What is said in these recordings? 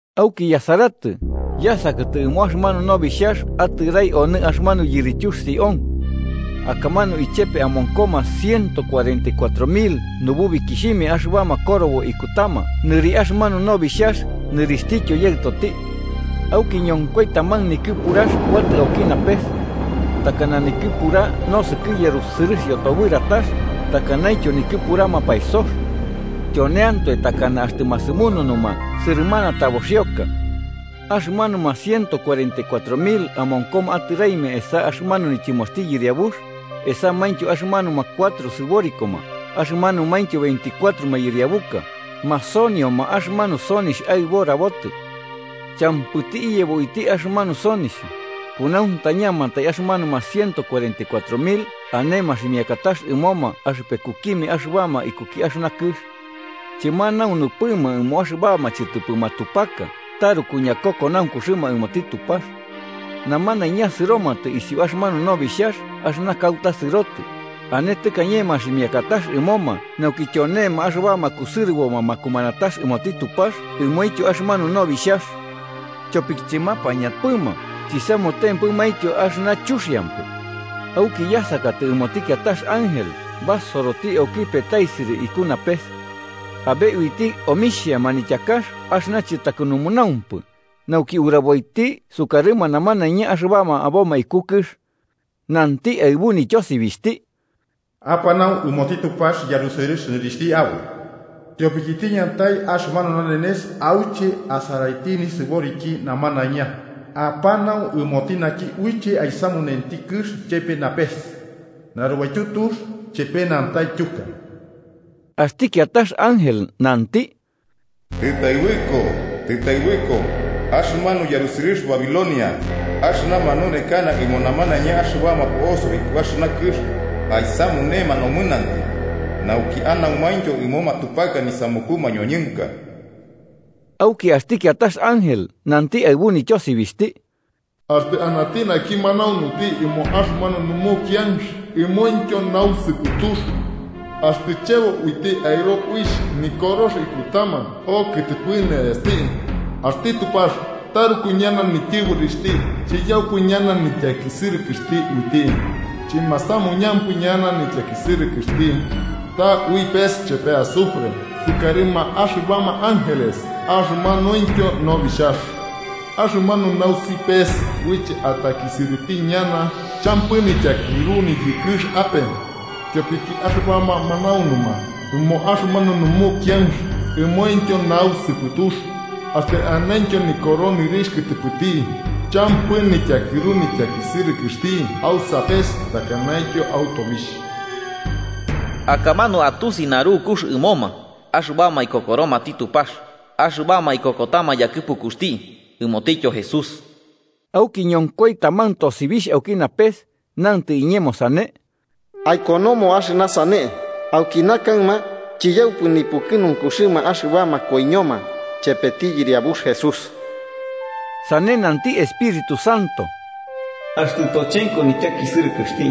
Auki yasaratɨ, yasakatɨ ɨmo axɨmanu Nobixhax atɨrai onɨ axɨmanu yirityux Sión. Akamanu ichepe amonkoma ciento cuarenta y cuatro mil nububikixhimia axɨbama korobo ikutama nɨri axɨmanu Nobixhax nɨrixhtityo Yaɨtoti. Auki ñonkoi taman nikɨpurax kuatɨ auki napes. Takana nikɨpura nosɨkɨ yarusɨrɨx yotobɨratax, takanaintyo nikɨpura mapaesox. Tyoneantoe takana axtɨ masɨmununuma sɨrɨmana taboxioka. Axɨmanuma ciento cuarenta y cuatro mil amonkoma atɨraimia esa axɨmanu nityɨmoxti Yɨriabux, esamaintyo axɨmanuma cuatro sɨborikoma axɨmanumaintyo veinticuatro mayɨriabuka, masonioma axɨmanu sonixh aɨbo rabotɨ. Champɨti iyebo uiti axɨmanu sonixh, kunauntañamantai axɨmanuma ciento cuarenta y cuatro mil ane maximiakatax ɨmoma axɨpekukimia axɨbama ikuki axɨna kɨx. Chɨmanaunupɨma ɨmoma axɨbama chɨtɨpɨ matupaka taruku ñakokonaunkuxɨma ɨmoti Tupax. Namanaiña sɨromatɨ isiu axɨmanu Nobixhax axɨna kauta sɨrotɨ, ane tɨkañe maximiakatax ɨmoma nauki tyonema axɨbama kusɨrɨboma makumanatax ɨmoti Tupax ɨmointyo axɨmanu Nobixhax. Tyopiki chɨmapañampɨma chisamutempɨmaintyo axɨna chuxiampɨ. Auki yasakatɨ ɨmoti kiatax ángel basoroti auki petaisɨrɨ iku napes. Abe uiti omixhia manityakax axɨna chɨtakɨnunaumpɨ, nauki uraboiti sukarɨma namanaiña axɨbama aboma iku kɨx. Nanti aɨbu nityosibixhti: “Apanau ɨmoti Tupax yarusɨrɨx nɨrixhti aboi, tyopiki tiñatai axɨmanu nanenes auche asaraiti nisɨboriki namanaiña. Apanau ɨmoti naki uiche aisamunenti kɨx chepe napes, narubaityu tux chepe nantaityuka.” Axti kiatax ángel, nanti: “¡Tɨtaɨbɨko, tɨtaɨbɨko axɨmanu yarusɨrɨx Babilonia, axɨna manunekana ɨmo namanaiña axɨbama po'osoma iku axɨna kɨx aisamunema nomɨnantɨ nauki anaumaintyo ɨmo matupaka nisamuku mañoñɨnka!” Auki axti kiatax ángel, nanti aɨbu nityosibixhti: “Axtɨ anati naki manaunuti ɨmo axɨmanu numukianx ɨmointyo nausɨpɨtux, axtɨ chebo uiti aɨro uixh nikorox ikutama okɨtɨpɨ ne'esti, axti Tupax taruku ñana nityɨborixhti chiyaupɨ ñana nityakisɨrɨkɨxti uiti. Chɨmasamuñampɨ ñana nityakisɨrɨkɨxti, ta ui pes chepe azufre sukarɨma axɨbama ángeles axɨmanuintyo Nobixhax. Axɨmanu nausi pes uiche atakisɨrɨti ñana champɨ nityakɨru niyɨkɨx ape, tyopiki axɨbama manaunuma ɨmo axɨmanu numukianx ɨmointyo nausɨpɨtux, axtɨ anentyo nikoro nɨrixh kɨtɨpɨti, champɨ nityakɨru nityakisɨrɨkɨxti au sapes takanaintyo au tobixh.” Akamanu atusi narukux ɨmoma axɨbama ikokoromati Tupax, axɨbama ikokotama yakɨpukuxti ɨmotityo Jesús. Auki ñonkoi taman tosibixh auki napes, nantɨ iñemo sane: “Aikonomo axɨna sane: ‘Aukina kaɨma chiyaupɨ nipukɨnunkuxɨma axɨbama koiñoma chepeti Yɨriabux Jesús.’” “Sane–nanti Espíritu Santo–, axtɨ tochenko nityakisɨrɨkɨxti,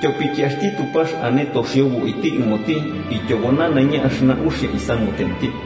tyopiki axti Tupax ane toxiobo uiti ɨmoti ityobo nanaiña axɨna uxia isamutenti.”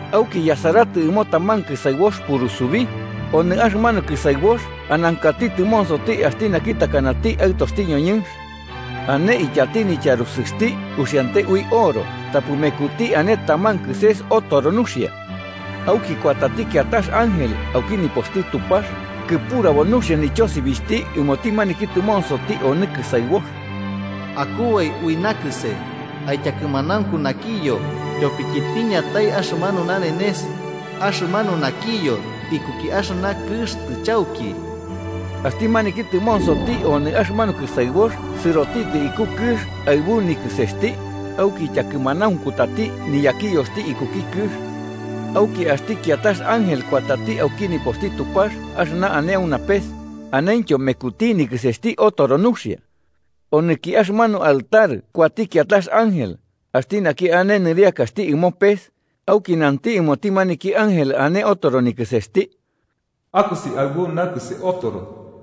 Auki yasaratɨ, ɨmo taman kɨsaɨbox purusubi, onɨ axɨmanu kɨsaɨbox anankati tɨmonsoti axti naki takanati aɨtoxti ñoñɨnx. Ane ityati nityarusɨxti uxiante ui oro tapɨ mekuti ane taman kɨses otoro nuxia. Auki kuatati kiatax ángel auki nipoxti Tupax, kɨpurabo nuxia nityosibixhti ɨmoti maniki tɨmonsoti onɨ kɨsaɨbox: “¡Akubai ui nakɨse, aityakɨmanaunku nakiyo. Tyopiki tiñatai axɨmanu nanenes, axɨmanu nakiyo ikuki axɨna kɨx tɨchauki!” Axti maniki tɨmonsoti onɨ axɨmanu kɨsaɨbox sɨrotitɨ iku kɨx aɨbu nikɨsesti, auki ityakɨmanaunkutati niyakiyoxti ikuki kɨx. Auki axti kiatax ángel kuatati auki nipoxti Tupax axɨna ane au napes, anentyo mekuti nikɨsesti otoro nuxia. Onɨki axɨmanu altar kuati kiatax ángel, axti naki ane nɨriakaxti ɨmo pes, auki nanti ɨmoti maniki ángel ane otoro nikɨsesti: “¡Akosi aɨbu nakɨse otoro,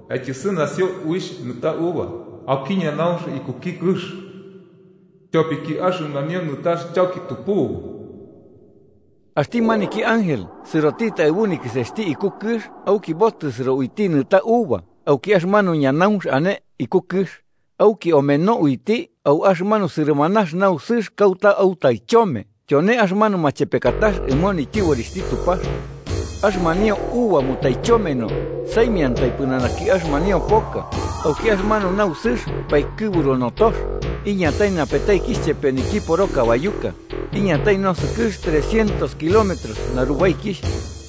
aityɨsɨnasio uixh nɨta uva auki ñanaunx ikuki kɨx, tyopiki axɨmanio nɨtax chauki tupubu!” Axti maniki ángel sɨrotitɨ aɨbu nikɨsesti iku kɨx auki botɨsɨro uiti nɨta uva auki axɨmanu ñanaunx ane iku kɨx, auki omeno uiti au axɨmanu sɨrɨmanax nausɨx kauta autaichome tyone axɨmanu machepekatax ɨmo nityɨborixhti Tupax. Axɨmanio uva mutaichomeno saimiantai pɨnanaki axɨmanio poka, auki axɨmanu nausɨx paikɨburu notox, iñatai napetaikixh chepe niyokiporo kabayuka, iñatai nosɨkɨx trescientos kilómetros narubaikixh.